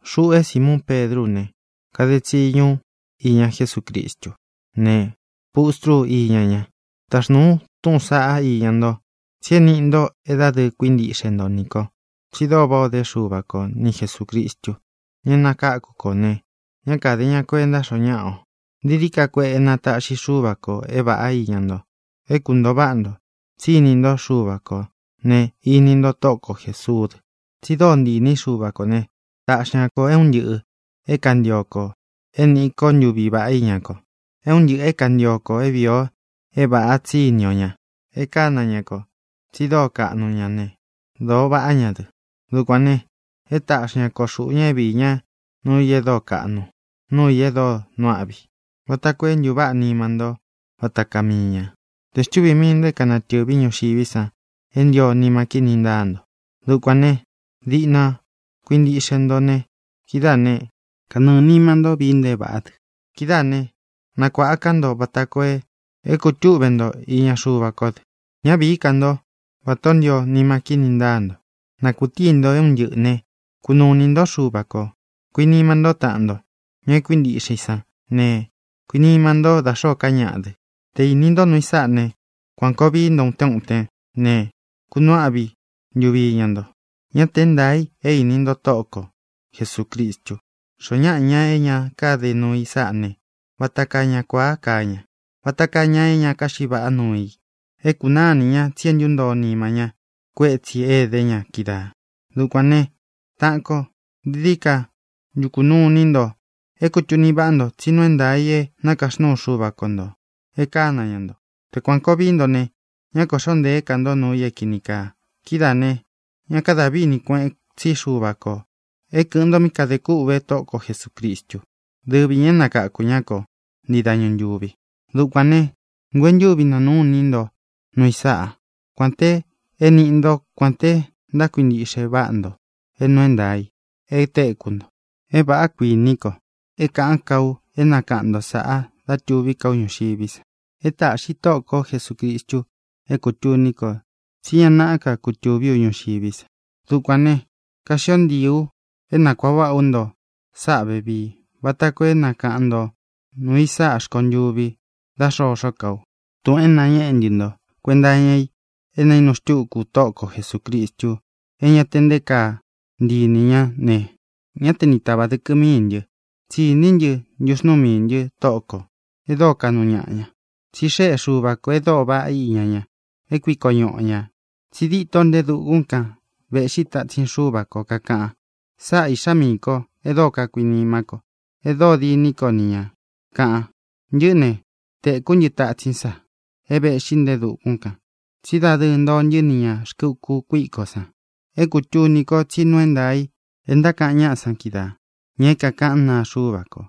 Xuꞌu é Simuun Pedrú u ne, kade tsiñu ú iña Jesúcristú ne, pustrú u iña ña. Taxnūu u túꞌūn saꞌá iña nto, tsi é nīꞌi nto é dadɨɨ kuíntiꞌxe nto nī kó, tsi dóo váꞌā ó de Xuva ko ni Jesūcristu, ña é nakáku kō ne, ñá kāde ña kuenta xoo náꞌa o. Dií dií ka kueꞌe na tāꞌxí Xuva kō é vāꞌá iña nto, é kuntōo váꞌa nto, tsí ini nto Xuva kō ne, iní nto Tóꞌo ko Jēsuú dɨ. Tsi dóo ntii īní Xuva kō né, taꞌxi ña kō é un ntɨꞌɨ̄ é kantio kō é nīꞌi ko ntuví vaꞌá iña ko, é un ntɨꞌɨ̄ é kantio kō é vīi o é vāꞌa, tsí ini o ña. E kána ña kō, tsi dóo kaꞌnu ña ne, dōo vaꞌá ña dɨ. Dukuān ne, e táꞌxi ña ko xūꞌu ña é viī ñá nuu i e dóo kaꞌnu, nuu i e dóo nuu áꞌvi i, vata koo é ntuváꞌa nima ntó vata kaa mii ña, te xtuvī mii nto é kānatɨ́vi ñuxiví san é ntio nima kíni ntáa nto. Dukuān né, diꞌna na kuīntiꞌxe nto ne, kidáā né, kanɨɨ̄ nima nto vii nto é vāꞌá dɨ. Kidáā né, nakuāꞌa ká nto vata koo é kutuꞌve nto iña Xuva kó dɨ. Ñá vīí ka nto vatā ó ntio nima kíni ntáa nto. Na kūtíi nto é un ntɨꞌɨ̄ né, kunuu inī ntó Xuva kō. Kuinima ntó taꞌan nto, ña kuíntiꞌxe i sán ne, kuinima ntó da xōó ka ñaꞌa dɨ. Tē íni nto nuu i sáꞌa ne, kuān koo vii nto utén utén ne, kunuu áꞌvi ntuvi iña nto. Ñá tē é ntaā i é īni nto Tóꞌo ko Jesūcristu. Xoó ñaꞌa, ña é ña káde nuu i sáꞌa ne, vata kaa ña kuāa kaa ña, vata kaa ña é ña káxiꞌi vaꞌá nuu i. É kūnaá ini ña tsi é ntuntoo nima ñá kuétsī é edé ña kídaā. Dukuān né, taꞌan ko, dií dií ka ntukū nuu iní nto é kūtuni váꞌa nto tsí nuu é ntaā i é nakaxnúu Xuva ko ntō, e kána ña nto. Te kuān koo vií nto ne, ñá kōꞌxó ntēé ka nto nuu i é kīni kaa. Kidáā ne, ña kada vini kuéꞌen tsi Xuva kō é kɨ̄ꞌɨn nto mí kadē kûꞌve Tóꞌo ko Jesūcristu, dɨ́vi ñā é nakakū ñá ko, ntii dañu ntūvi. Dukuān ne, nguentúvi nanuꞌu u iní nto nuu i sáꞌa, kuān te é ini nto, kuān te ntákuintiꞌxe váꞌa nto é nuu é ntaā i e téku nto. É vāꞌá, kuiní ko, é kāꞌán ka u é nakaꞌan ntō sáꞌā, dá tuví ka u ñuxiví san. E táꞌxi Tóꞌo ko Jesūcristu é kūtuní ko tsí ña naꞌá ka kutūví u ñuxiví sa. Dukuān ne, kaxío ntiī u é nakuāꞌa váꞌa ú nto sáꞌā vevií, vata koo é nakaꞌan nto nūu i sáꞌa rkontuvi dá xoxó ka u. Tūꞌun é nañeꞌé ntɨ nto kuenta iña i é naīnu xtúku Tóꞌo ko Jesūcristu é ña te nté kaa ntii inī ñá ne, ñá te ni tāvá dɨkɨ mií ntɨ, tsi íni ntɨ ntuxnúu miī ntɨ Tóꞌo kō e dóo kaꞌnu ñaꞌa ña. Tsi xéꞌe Xuva kō e dóo vaꞌá iña ña, é kuiko ñuꞌu o ñā. Tsi díto nte e dukún kan vēꞌxí tatsin Xuva ko, kakáꞌan, “Sáꞌa Īꞌxá miī ko e dóo kakuinimá ko, e dóo diní ko ni ñā”, kaꞌan. Ntɨꞌɨ́ ne, tēkú ntɨ tatsín san é vēꞌxí nte e dukún kān, tsí dadɨɨ ntoo ntɨ́ ni ñā rkɨ uku kuikó san. É kūtuni ko tsí nuu é ntaā i é ntákaꞌan náꞌa san kídaā, ña é kaꞌán naa Xuva ko.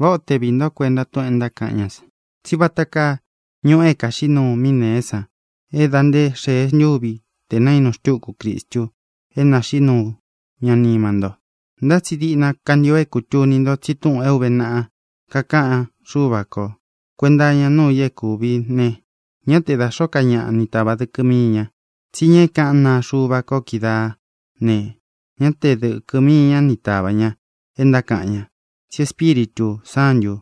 Váꞌā ó te viī ntó kuenta túꞌūn e ntákaꞌan ñá san, tsí vata kaa ñuꞌu é kāxiꞌí nuu mí nēé san é dā nté xēe ntúvi tē naínu xtúku Cristu é nāxiꞌí nuu ña nima nto. Ntá tsi diꞌna kantio é kūtuni nto tsi túꞌūn é ūve naꞌa kakáꞌan Xúva ko kuēnta iña nuu i é kūvi ne, ñá te da xōó ka ñaꞌa ni tāvá dɨkɨ mii ña. Tsí ña é kāꞌán naa Xuva ko kídaā ne, ñá te dɨ̄kɨ mii ña ni tavá ña é ntákaꞌan ña, tsí Espíritū Sántū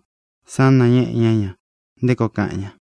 san nañéꞌe ñá ña nté koo kaꞌan ña.